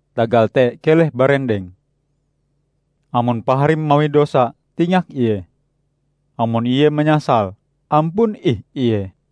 Tagal te keleh barendeng! Amon paharim mawi dosa, tingak ie. Amon ie manyasal, ampun ih ie.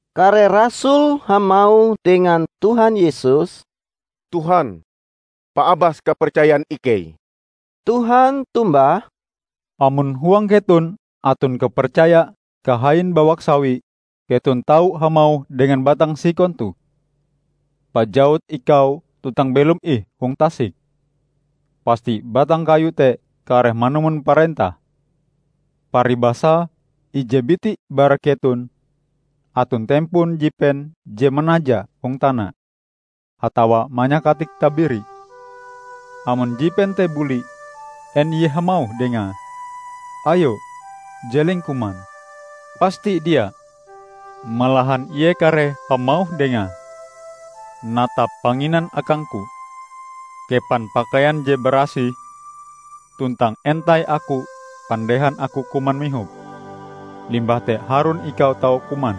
Kare rasul hamauh dengan Tuhan Yesus, "Tuhan, paabas kapercayan ikei." Tuhan tombah, "Amon huang keton aton kapercaya kahain bawak sawi, keton tau hamauh dengan batang sikon toh, 'Pajawut ikau tuntang belom ih hong tasik,' pasti batang kayu te kareh manumon parentahm." "Paribasae ije biti bara keton aton tempon jipen je manaja hong tana atawa manyakatik tabiri. Amon jipen te buli, en ie hamauh dengae, 'Ayo jeleng kuman'? Pasti dia! Malahan ie kareh hamauh dengae, 'Natap panginan akangku. Kepan pakaian je barasih tuntang entai aku pandehan aku kuman mihop; limbah te harun ikau tau kuman.'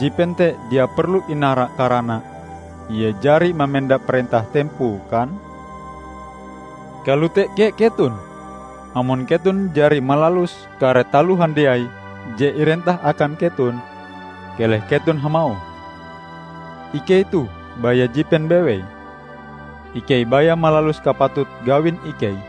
Jipen te dia perlu inara karana ie jari mamenda parentah tempoe, kan? Kalote kea keton. Amon keton jari malalus kare taloh handiai je irentah akan keton, keleh keton hamauh, 'Ikei toh baya jipen bewei, ikei baya malalus kapatut gawin ikei.' "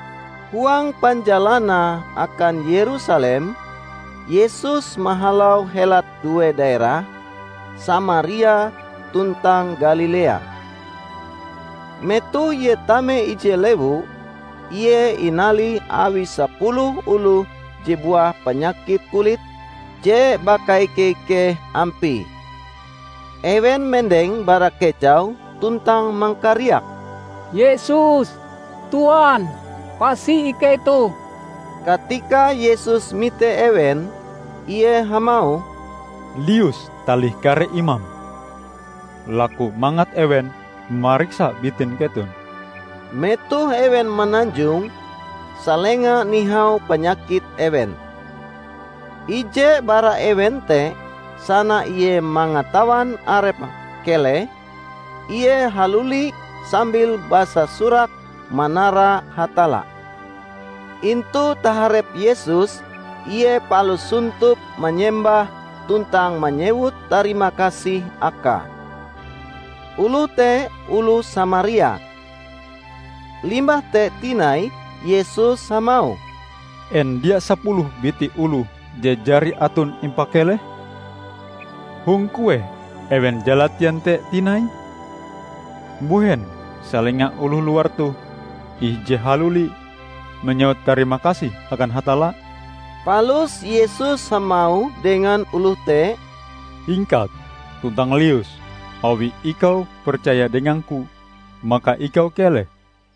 Huang panjalanae akan Yerusalem, Yesus mahalau helat due daerah, Samaria tuntang Galilea. Metoh Ie tame ije lewu, Ie inalih awi sapuluh oloh je buah panyakit kulit je bakaike-ikeh ampie. Ewen mendeng bara kejau tuntang mangkariak, "Yesus! Tuan! pasi ikei toh!" Katika Yesus mite ewen, Ie hamauh, "Lius talih kare imam, laku mangat ewen mariksa bitin keton." Metoh ewen mananjong, salenga nihau panyakit ewen. Ije bara ewen te, sana ie mangatawan arepe keleh, ie haluli sambil basasurak manara Hatalla. Intu taharep Yesus ie palus sontop manyembah tuntang manyewut tarimakasih akae. Oloh te oloh Samaria. Limbah te tinai Yesus hamauh, "En dia sapuluh biti oloh je jari aton impakeleh? Hong kueh ewen jalatien te tinai? Mbuhen salenga oloh luar toh ih je haluli manyewut tarimakasih akan Hatalla?" Palus Yesus hamauh dengan oloh te, "Hingkat, tuntang lius. Awi ikau percaya dengang-Ku, maka ikau keleh."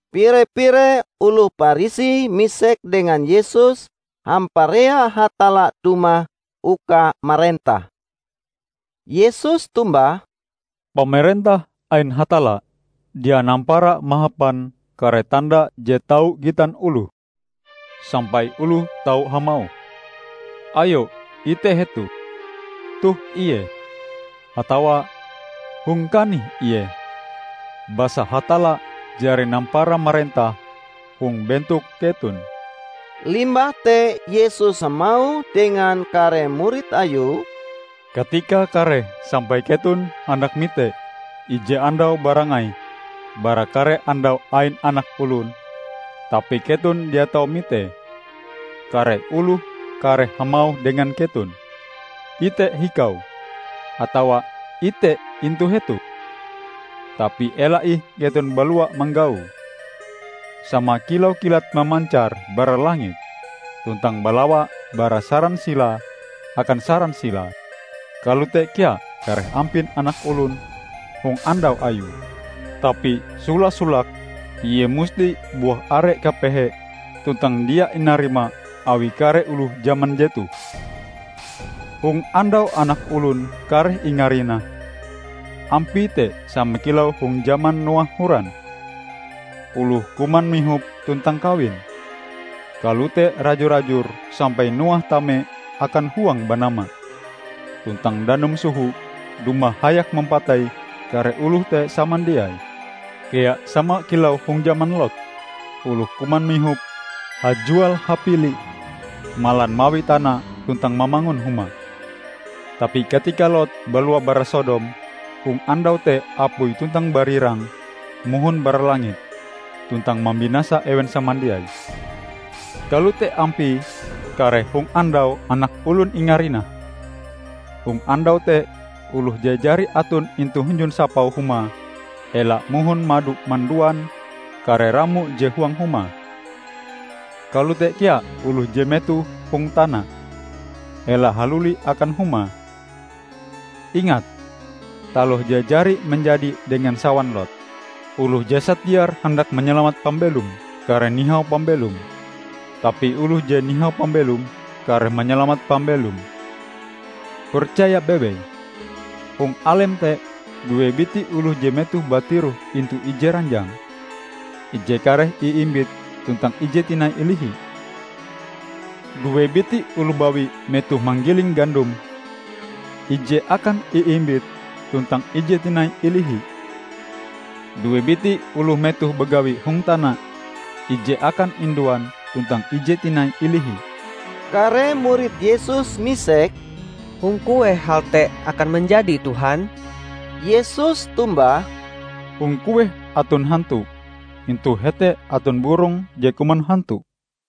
Pire-pire oloh Parisi misek dengan Yesus hamparea Hatalla dumah uka marentah. Yesus tombah, "Pamarentah ain Hatalla dia nampara mahapan kare tanda je tau gitan oloh, sampai oloh tau hamauh, 'Ayo ite hetoh, toh ie!' atawa, 'Hong kanih ie!' Basa Hatalla jari nampara marentah hong bentok keton." Limbah te Yesus hamauh dengan kare murid Ayue, "Katikae kareh sampai keton handak mite ije andau barangai bara kare andau ain Anak Olon, tapi keton dia tau mitee. Kare oloh kareh hamauh dengan keton, 'Ite, hikau!' atawa, 'Ite, intu hetoh!' Tapi ela ih keton balua manggaue. Sama kilau kilat mamancar bara langit, tuntang balawa bara saran silae akan saran silae, kalote kea kareh ampin Anak Olon hong andau Ayue. Tapi sola-solake ie musti buah are kapehe tuntang dia inarima awi kare oloh jaman jetoh. Hong andau Anak Olon kareh ingarinah, ampie te sama kilau hong jaman Noah horan. Oloh kuman mihop, tuntang kawin; kalote raju-rajur sampai Noah tame akan huang banama tuntang danum soho dumah hayak mampatei kare oloh te samandiai. Kea sama kilau hong jaman Lot. Oloh kuman mihop, hajual-habili, malan mawi tana tuntang mamangun huma. Tapi katika Lot balua bara Sodom, hong andau te apui tuntang barirang mohon bara langit tuntang mambinasa ewen samandiai. Kalote ampie kareh hong andau Anak Olon ingarinah. Hong andau te oloh je jari aton intu hunjun sapau humae ela mohon mado manduan kare ramo je huang huma. Kalote kea oloh je metoh hong tana ela haluli akan humae. Ingat taloh je jari manjadi dengan sawan Lot! Oloh je satiar handak manyalamat pambelome, kareh nihau pambelome. Tapi oloh je nihau pambelome kareh manyalamat pambelome. Percaya bewei: Hong alem te, due biti oloh je metohe batiroh intu ije ranjang, ije kareh iimbit tuntang ije tinai ilihi. Due biti oloh bawi metohe manggiling gandom, ije akan iimbit tuntang ije tinai ilihi. [ Due biti oloh metohe bagawi hong tana, ije akan induan tuntang ije tinai ilihi.]" Kare murid Yesus misek, "Hong kueh hal te akan manjadi Tuhan?" Yesus tombah, "Hong kueh aton hantu, intu hete aton burong je kuman hantu."